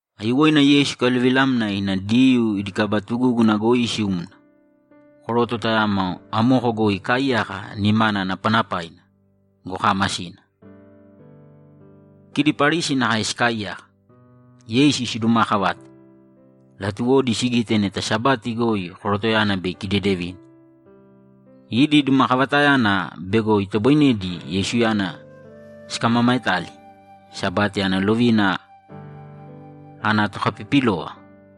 Aiyuwoina Yeisu ikaluvilamna ina Diyuu idi kaba tugúguna goi isiumna. Koroto tayamo amoko goi ikaaiyaka, nimana napanapaina go, kaamasina. Kidi Parisi nakae sikaaiyaka, Yeisu sidumaakavate; latuwodi sigite neta Sabati goi korotoyana bei ikidedevine. Idi dumakavatayana bego itoboinedi Yeisuyana sikamamaetali Sabati ana lovina ana tokapipilova.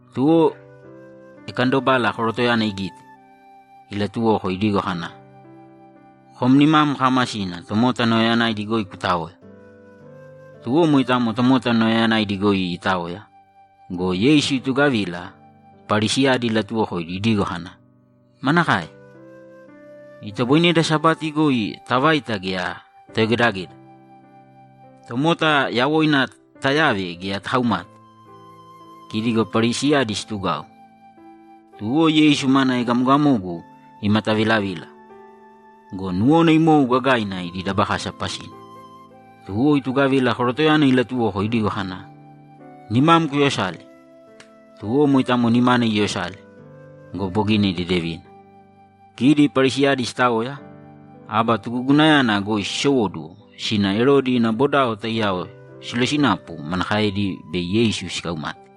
Tuwo ikandobala korotoyana igite, ilatuwoko idigo kana, ‘Kom nimam kaamasina, tomota nauyayanaidi goi kutāoya!’ Tuwo moitamo tomota nauyayanaidi goi itaoya go, Yeisu itugavila, Parisiyadi ilatuwokoidi idigo kana, ‘Manakae? Itoboineda Sabati goi tavaita gea tayogedageda? Tomota yawoina tayave gea takaumate?’ Kidi go Parisiyadi situgau. Tuwo Yeisu mana egamogamogu imatavilavila go, nuwona imou gagaina idi dabakasa pasina. Tuwo itugavila korotoyana ilatuwoko idigo kana, ‘Nimam kuyosāle!’ Tuwo moitamo nimana iyosale go, bogina idedevina. Kidi Parisiyadi sitaoya, aba tugugunayana goi sisowóduwo sina Erodi ina bodao taiyao silosinapu manakaedi bei Yeisu sikaumate.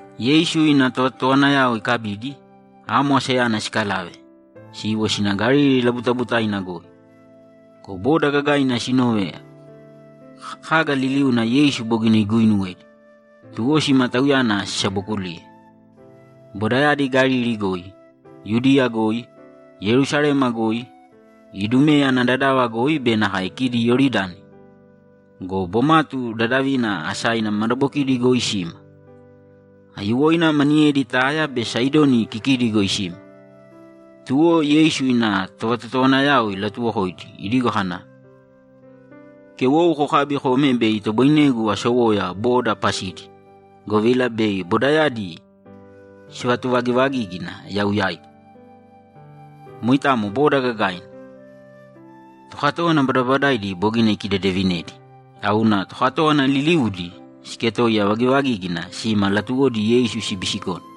Yeisu ina tovatotowanayao ikabidi, amo asayana sikalave, siiwo sina Galili labutabutaina goi. Go boda gagaina sinove kaga liliuna Yeisu bogina iguinuwedi, tuwo sima Tauyana sisabokuliye. Bodayadi Galili goi, Yudiya goi, Yerusalema goi, Idumeya ana dadava goi be nakae kidi Iyoridani go, bomatu dadavina asaina madabokidi goi sima. Aiyuwoina maniyedi Taya be Saidoni kikidi goi sima. Tuwo Yeisu ina tovatotowanayao ilatuwokoidi idigo kana, ‘Kewou kokābi kōme bei itoboinegu asowoya boda pasidi, govila bei bodayadi sivatuvagivagígina yau yaigu.’ Moitamo boda gagaina. Tokatówana badabadaidi bogina ikidedevinedi, tauna tokatówana liliuudi siketoiya vagivagígina sima latuwodi Yeisu sibisikone.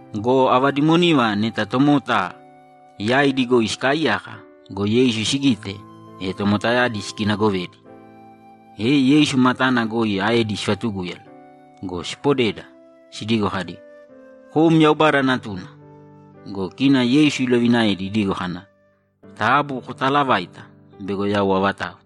Go ava dimoniva neta tomota yaidi goi sikaaiyaka go, Yeisu sigite, e tomotayadi sikinagovedi, e Yeisu matana goi aedi sivatugúyala go, sipodeda, sidigo kadi, ‘Kom Yaubada Natuna!’ Go kina Yeisu ilovinaedi idigo kana, ‘Taabu kotaalavāita bego yau avatau.’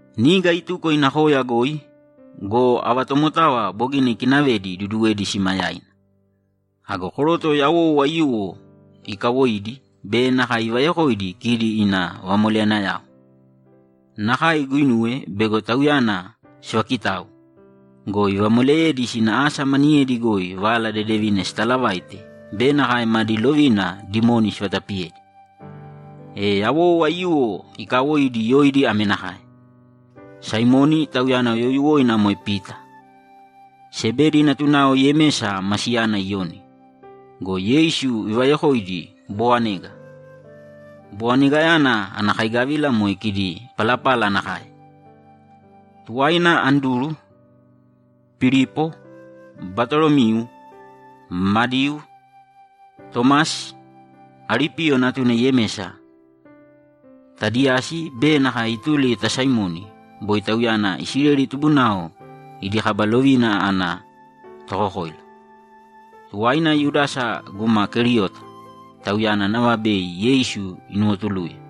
Niga ituko ina koya goi go, ava tomotava bogina ikinavedi iduduwedi sima yaina. Ago koroto yawou aiyuwo ikawoidi be nakae ivayokoidi kidi ina vamoleyanayao. Nakae iguinuwe bego Tauyana sivakitau go, ivamoleyedi sina asa maniyedi goi Vala Dedevina sitalavaite be nakae madi lovina dimoni sivatapiyedi. E yawou aiyuwo iikawoidi yoidi ame nakae: Saimoni (tauyana youyuwoina moe Pita), Sebedi natunao Yemesa ma siyana Iyoni go, Yeisu ivayokoidi Bowanega. (Bowanegayana ana kaigavila moe kidi palapala nakae.) Tuwaina Anduru, Pilipo, Batolomiu, Madiu, Tomasi, Alipiyo natuna Yemesa, Tadiyasi be nakae ituli ta Saimoni (boi tauyana Isileli tubunao idi kaba lovina ana tokokoila). Tuwaina Yudasa guma Keriota; tauyana nava bei Yeisu inuwotuluye.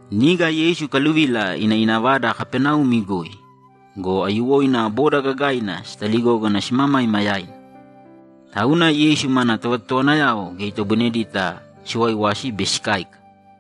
Niga Yeisu ikaluvila ina ina vada Kapaneumi goi go, aiyuwoina boda gagaina sitaligógana simamaima yaina. Tauna Yeisu mana tovatotowanayao geya itoboinedita siwaiwasi be sikáika.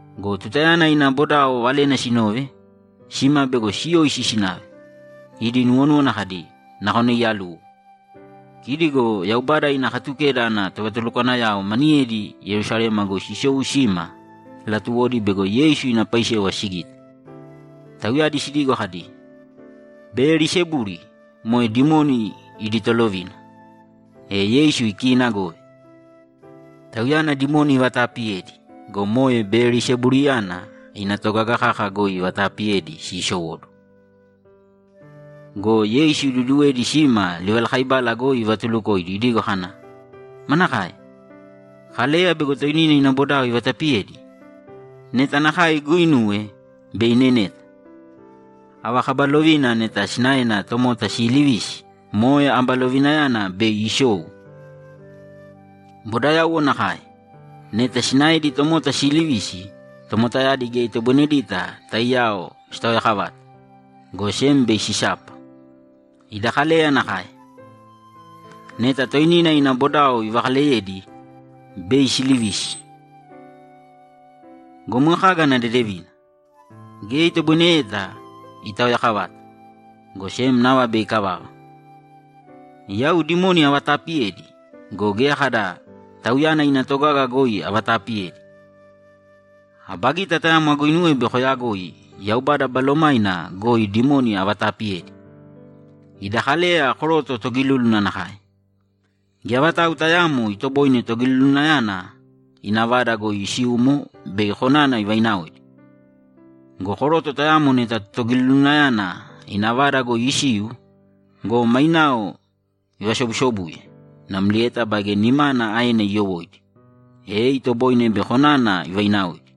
Go tutayana ina bodao valena sinove, sima bego siyoisi sinave; idi nuwonúwana kadi, ‘Nakona iyaluwo.’ Kidi go Yaubada ina Katukeda ana tovatulukwanayao maniyedi Yerusalema goi sisou sima latuwodi bego Yeisu ina paisewa sigite. Tauyadi sidigo kadi, ‘Beyelisebuli moe dimoni idi tolovina, e Yeisu ikiinagove. Tauyana dimoni ivataapiyedi go, moe Beyelisebuliyana ina togaga kaka goi ivataapiyedi siisowóduwo.’ Go Yeisu iduduwedi sima livalakaibala goi ivatulukoidi idigo kana, ‘Manakae? Kaleya bego toinina ina bodao ivatapiyedi? Neta nakae iguuinuwe, bei ineneta. Ava kaba lovina neta sinaena tomota siilivisi, moe aba lovinayana bei isou. Bodayauwo nakae. Neta sinaedi tomota siilivisi, tomotayadi geya itoboinedita taiyao sitaoyakavata, go sem bei sisapa. Ida Kaleya nakae. Neta toinina ina bodao ivakaleyedi, bei silivisi. Go moe kaga ana dedevina? Geya itoboineyeta itaoyakavata, go sem nava bei ikavava. Yau dimoni avataapiyedi go, geya kada tauyana ina togaga goi avataapiyedi. Aba gita tayamo aguinuwe bei koyagoi Yaubada Balomaina goi dimoni avataapiyedi. Ida Kaleya koroto togilúluna nakae. Geya vatau tayaamo itoboine togilulunayana ina vada goi isiumo bei konana ivainaoidi. Go koroto tayamo neta togilulunayana ina vada goi isiu go, mainao ivasobusobuye namlieta baige nimana aena iyowóidi, e itoboine bei konana ivainaoidi.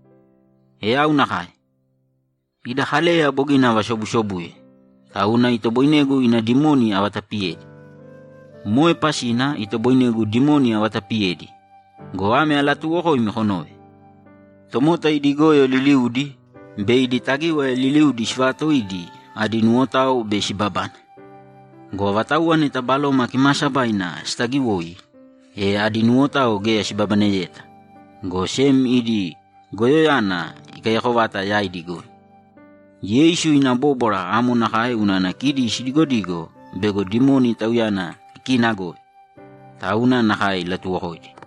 E yau nakae. Ida Kaleya bogina avasobusobuye, tauna itoboinegu ina dimoni avatapiyedi. Moe pasina itoboinegu dimoni avatapiyedi go, ame alatuuwokoimi konōve: Tomota idi goyo liliudi be idi tagíwaya liliudi sivaatoidi adi nuwotao bei sibabane. Go avatauwa neta Baloma Kimaasabaina sitagiwoi, e adi nuwotao geya sibabaneyeta, go sem idi goyoyana ikaiyako vata yaidi goi.’ Yeisu ina bóbwara amo nakae unana kidi sidigodigo bego dimoni Tauyana ikiinagove. Tauna nakae ilatuwokoidi.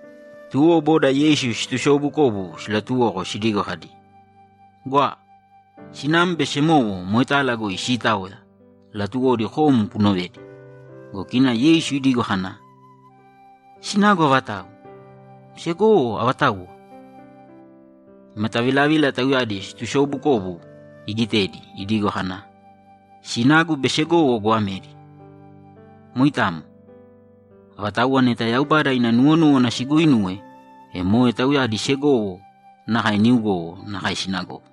Tuwo boda Yeisu situsoobukobu silatuwoko sidigo kadi, ‘Gwa! Sinam be semowo moetala goi siitaoya; latuwodi kom kunovedi.’ Go kina Yeisu idigo kana, ‘Sinagu avatau? Segowo avatauwa?’ Imatavilavila tauyadi situsoobukobu igitedi idigo kana, ‘Sinagu be segowo goamedi. Moitamo. Avatauwa neta Yaubada ina nuwonúwana siguuinuwe, e moe tauyadi segowo nakae niugowo nakae sinagowo.’